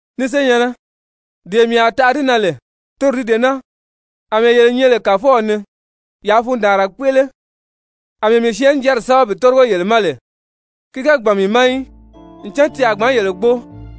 Ni senyɛ̀nnɛ, dee mii a taʔa di na lè, toro di dee naa, àmɛɛ yele nyɛ lè Kàfɔw ni, yaa fundaanra kpéʔele. Amɛɛ mii syɛɛnnijanri sɛ́bɛ bi tórigo yele ma lè, ki ga gbàn mii ma í, ncan ti a gbǎn yele gbóo.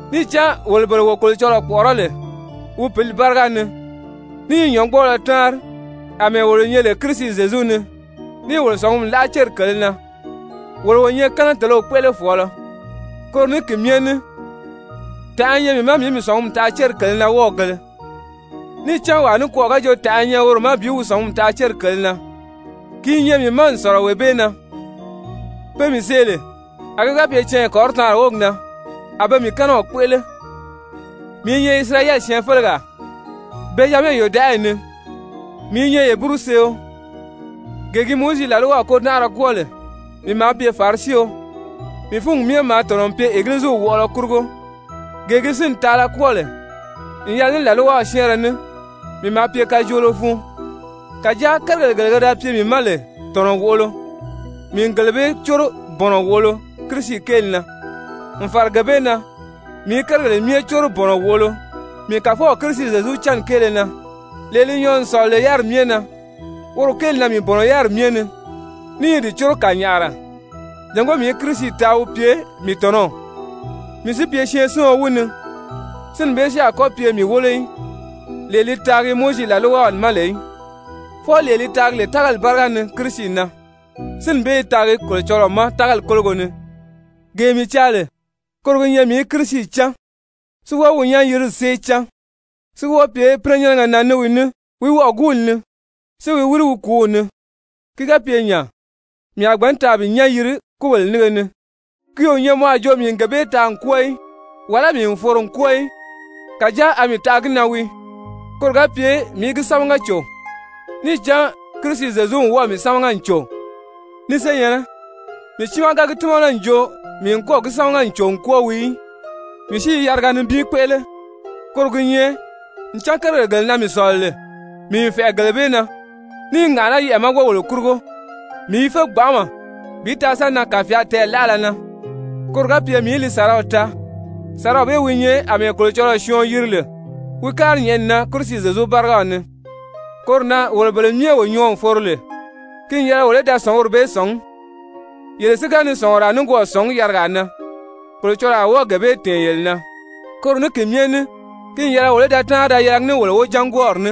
Níì cán wolo bele wo Kolocɔlɔɔ kpɔ̀ʔɔrɔ́ lè wi Pǐli báriga ni, ní i nyɔ̌ngbɔɔlɔ táanri àmɛɛ wolo nyɛ lè Kirisi Zyezu ni, níì wolo sɔ̀ngumi láʔa céri kèlē na, wolo wo nyɛ kɛ́nɛtelew kpéʔelefɔɔlɔ. Koro ní ki myɛ ní tànʔa i nyɛ mii ma mii í mii sɔ̀ngumi taʔa céri kèlē na wɔ́ɔgēle. Níì cán wàa nikwɔɔ ga jo tànʔa i nyɛ woro ma bi wi sɔ̀ngumi taʔa céri kèlē na, ki i nyɛ mii ma n sɔ̀lɔ wee bee na, pe mii see lè, a ki ga pye canya kɔrɔtaanri wógi na, a be mii kɛ́nɛw kpéʔele, mii i nyɛ Isirayɛli syɛɛnfelegaa, Bɛnzyamɛ yòdaʔayi ni, mii i nyɛ Heburuseeo. Gee gi Mowizi làlwaw kôdanʔara kwɔ́ɔ lè, mii maa pye Farisio. Mii fúngi myɛ maa tɔ̀nɔ n pye Egiliziw wɔʔɔlɔ kurugo. Gee gi sínni taala kwɔ́ɔ lè n yɛlɛ ní làlwaw syɛ́ɛnrɛ ní, mii maa pye kajoolo fun. Kàjáa kérigèle gele ke da pye mii ma lè tɔ̀nɔ wòʔolo, mii n gele bee córo bɔ̀nɔ wòʔolo Kirisi kéeli na. N fàra gee bee na, mii i kérigèle myɛ córo bɔ̀nɔ wòʔolo mii Kàfɔw Kirisi Zyezu cánni kéele na, lee li nyɔɔ n sɔ̀lɔ lè yáriri myɛ na. Woro kéeli na mii bɔ̀nɔ yáriri myɛ ni, ní i di córo kànyaʔara jàngó mii í Kirisi taa, wí pye mii tɔ̀nɔw, mii si pye syɛɛnsiɔn wi ni, sínni bee si a kɔ́ pye mii wólo í, lee li taagi Mowizi làlwaw ma lè í, fwɔɔ lee li taagi lè tágali báriga ni Kirisi na, sínni bee i taagi Kolocɔlɔɔ ma tágali kólogo ni. Gee mii caa lè, koro gi nyɛ mii í Kirisi cán, si wɔ́ɔ wi nyán-yirili sée cán, si wɔ́ɔ pye pínɛnyɛnnɛgɛ na ní wi ní wi wɔʔɔguuli ni, si wi wíri wi kùúw ni. Ki ga pye nya, mii a gbǎn taa bi nyán yiri kúbèle nínge ni. Ki o nyɛ mɔ a jo mii n gee bee taa n kwɔ́ɔ í, wàlá mii n foro n kwɔ́ɔ í. Kàjáa a mii taʔa gi na wii, koro ga pye mii í gi sámaga cò, níì cán Kirisi Zyezu n wɔ́ɔ̀ mii sámaga n cò. Ni senyɛ̀nnɛ, mii tiimaa ga gi tímana n jo mii n kɔ́ɔ̀ gi sámaga n cò n kwɔ́ɔ wii í. Mii si i yariga nibin kpéʔele, koro gi nyɛ ncan kérigèle gele na mii sɔ̀lɔ lè, mii n fɛ̀ʔɛ gele bee na, ní i ŋàʔaná yɛʔɛ̀ ma wógèle kurugo. Mii i fé gbanʔama bi taa sa nan kàfyaali tɛɛlaʔala na, koro ga pye mii í li sàraw taa, sàraw bee wi nyɛ àmɛɛ Kolocɔlɔɔ syɔɔn yiri lè wi kári nyɛ̀ʔɛni na Kirisi Zyezu bárigaw ni. Koro na, wolo bele myɛ wo nyɔɔ n foro lè, ki n yɛlɛ wolo í da sɔ̀nguri bee sɔ̀ngí, yele si ga ni sɔ̀nguraa nikwɔɔ sɔ̀ngí yarigaa na, Kolocɔlɔɔ a wɔ́ɔ gee bee tɛ̀ɛn yele na. Koro ní ki myɛ ní, ki n yɛlɛ wolo í da táanri da yɛlɛgi ní wolo wojángwɔɔri ní.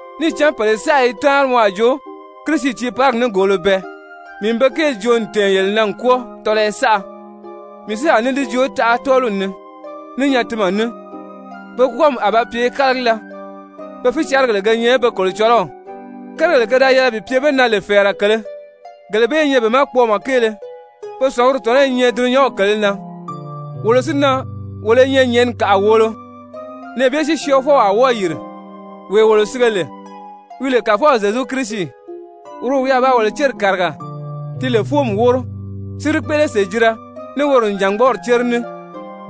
Níì cán pèle saʔa i táanri mɔ a jo Kirisi tiiparigi nígoolo bɛɛ. Mii n be kéeli joo n tɛ̀ɛn yele na n kwɔ́ɔ tɔlɔyɔ saʔa, mii si a ní di joo taʔa tɔ́ɔliw ni ní nyatinmɛ ní. Pe kwɔ́ɔmi a ba pye kálagila. Pe fícarigèle ge nyɛ pe kolocɔlɔw. Kérigèle ke da yɛlɛ bi pye be na lè fɛ̀ɛrɛ kèlē, gele bee i nyɛ be ma kpɔɔmɔ kéele. Pe sɔ̀nguri tɔ̀nɔ́ i nyɛ dulunyanw kèlē na. Wolo si na, wolo i nyɛ nyɛ̀ʔɛni kàʔa wòolo. Nɛɛ bee si Syɔɔfɔw a wɔ́ɔ yìri, wee wolo sige lè, wi lè Kàfɔw Zyezu Kirisi. Woro wi a ba wolo céri kàriga, ti lè fóomi wóro, si di kpéʔele sèjira ní woro nìjangbɔɔri cére ní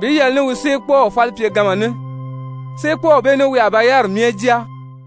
bi yɛlɛ ní wi séekpɔɔw falipyeganma ní, séekpɔɔw bee ní wi a ba yáriri myɛ jáa.